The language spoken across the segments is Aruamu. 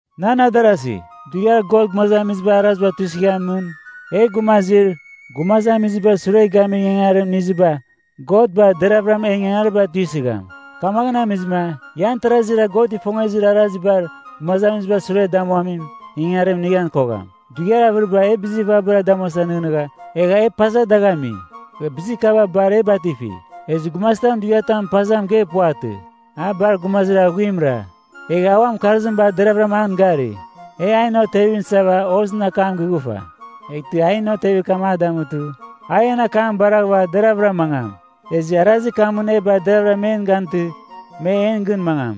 Nan adarasi, dughiar God gumazamizibar araziba tuisɨghamɨn, e gumazir, gumazamizibar sure gamir ingangarim iniziba, God bar deravɨra en ingangariba tuisɨgham. Kamaghɨn amizɨma, ian tarazira God ifongezir arazibar gumazamizibar sure damuamin ingangarim inighan kogham. Dughiar avɨribar e bizir vabara damuasa nɨghnɨgha, egha e paza dagh ami. Bizir kaba bar e batifi. Ezɨ gumazitam dughiatamɨn paza mɨgeir puvatɨ, a bar gumazir aghuimra, egha a uan mɨkarzim bar deravɨra an gari. E ainɨn otevim isava hozɨn akam gighufa, eghtɨ ainɨn otevir kam a damutɨ a en akam baraghɨva deravɨra mangam. Ezɨ arazir kamɨn e bar deravɨra men gantɨ, me en gɨn mangam.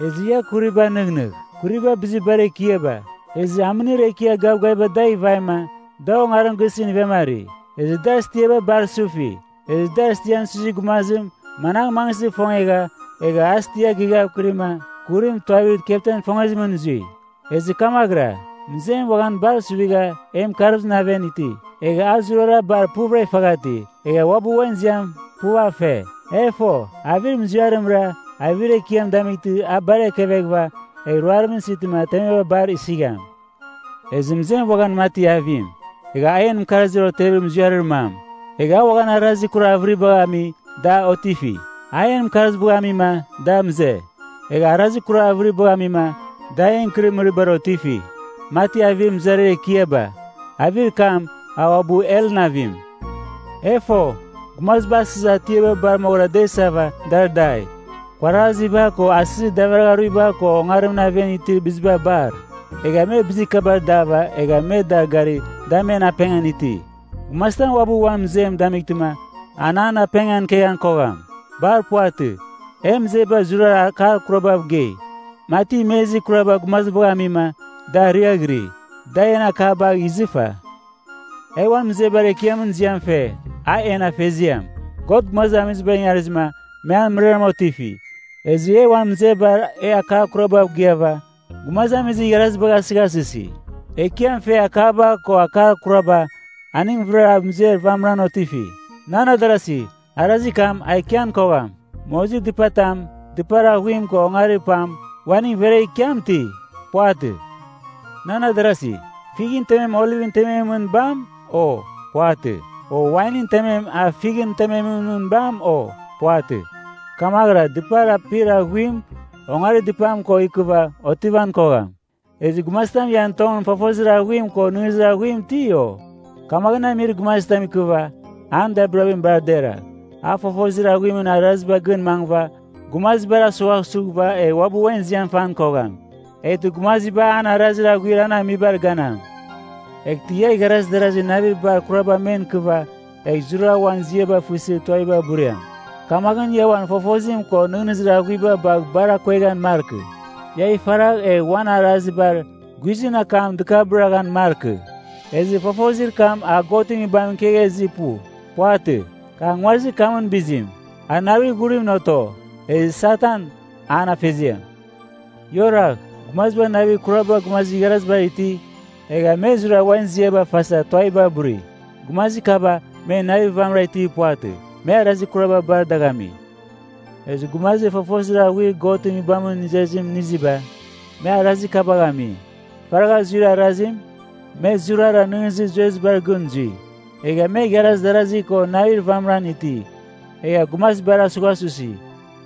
Ezɨ ia kuribagh nɨghnɨgh. Kuriba bizir bar ekiaba, ezɨ amɨnir ekiar gavgaviba dagh ivaima, da ongarim gisɨn ivemari. Ezɨ dar stiaba bar sufi. Ezɨ dar stian suizir gumazim managh mangɨsɨ ifongegha, egha a stia gighavkɨrima kurim tuavir kepten ifongezimɨn zui. Ezɨ kamaghɨra, mɨzem uaghan bar suvigha en mɨkarzimɨn aven iti. Egha a zurara bar puvɨra ifaghati, egha uabɨ uan ziam puv a fe. E fo, avir muziarimra avir ekiam damightɨ a bar ekeveghɨva egh ruarimɨn isitɨma temeba bar isigham! Ezɨ mɨzem uaghan mati avim, egha a en mɨkarzir otevir muziarir mam. Egha a uaghan arazir kurar avɨribagh ami da otifi. A en mɨkarzibagh amima da mɨze, egha arazir kurar avɨribagh amima da en ikɨrɨmɨribar otifi, mati avir mɨzariar ekiaba. Avir kam a uabɨ helɨn avim. E fo, gumaziba asɨzir atiaba bar moghɨra da isava dar dai, kuaraziba ko asɨzir davaragharuiba ko ongarimɨn aven itir biziba bar. Egha me bizir kabar dava egha me dar gari da men apengan iti. Gumazitam uabɨ uan mɨzem damightɨma an an apengan ikeghan kogham. Bar puvatɨ. En mɨzeba zurara akar kurabav gei. Mati imezir kuraba gumazibagh amima da ariaghiri, da en akabagh izɨfa. E uan mɨzebar Ekiamɨn ziam fe, a en Afeziam. God gumazamizibar ingarizɨma me an mɨrara otifi, ezɨ e uan mɨzebar e akar kurabav gɨava gumazamizir igharazibagh asɨghasɨsi. Ekiam fer akaba ko akar kuraba, aning vɨrara mɨzer vamɨram otifi. Nan adarasi, arazir kam a ikian kogham. Mozir dɨpatam, dɨpar aghuim ko ongarir pam, uaning veregh ikiam ti? Puvatɨ! Nan adarasi, fighɨn temem olivɨn tememɨn mɨn bam, o? Puvatɨ! O wainɨn temem a fighɨn temem mɨn bam, o? Puvatɨ! Kamaghɨra dɨpar apir aghuim ongarir dɨpam ko ikɨva otivan kogham. Ezɨ gumazitam ian tongɨn fofozir aghuim ko nɨghnɨzir aghuim iti, o? Kamaghɨn amir gumazitam ikɨva, an dabirabim bar deragh. A fofozir aghuimɨn arazibar gɨn mangɨva gumazibar asughasughɨva egh uabɨ uan ziam fan kogham. Eghtɨ gumaziba an arazir aghuir an amibar ganam. Eghtɨ ia igharaz darazi navir bar kuraba men ikɨva, egh zurara uan ziaba fɨsɨ tuaviba buriam, kamaghɨn ia uan fofozim ko nɨghnɨzir aghuiba bagh bar akueghan markɨ. Ia ifaragh egh uan arazibar guizɨn akam dɨkabɨraghan markɨ. Ezɨ fofozir kam a Godɨn Nguibamɨn ikegha izir pu. Puvatɨ, kar nguazir kamɨn bizim. A navir ghurimɨn oto. Ezɨ Satan, an afeziam. Ia oragh. Gumaziba navir kuraba gumazir igharazibar iti, egha me zurara uan ziaba fasa tuaviba buri, gumazir kaba me navir vamɨra itir puvatɨ. Me arazir kuraba bar dagh ami. Ezɨ gumazir fofozir aghuir Godɨn Nguibamɨn izezim iniziba, me arazir kabagh ami: Faragha zuir arazim, me zurara nɨghnɨzir zuezibar gɨn zui. Egha me igharaz darazi ko navir vamɨran iti, egha gumazibar asughasusi.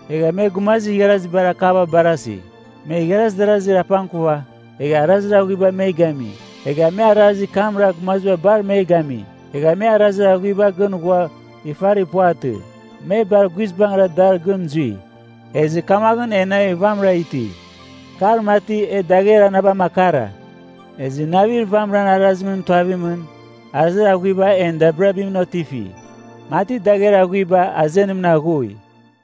Egha me gumazir igharazibar akaba barasi. Me igharaz darazir apangkuva egha arazir aghuibar me gami. Egha me arazir kamra gumaziba bar me gami. Egha me arazir aghuibar gɨn ghua ifarir puvatɨ. Me bar guizbangɨra dar gɨn zui. Ezɨ kamaghɨn e navir vamɨra iti, kar mati e dagher anabam akara. Ezɨ navir vamɨran arazimɨn tuavimɨn, arazir aghuiba en dabirabimɨn otifi, mati dagher aghuiba azenimɨn aghui.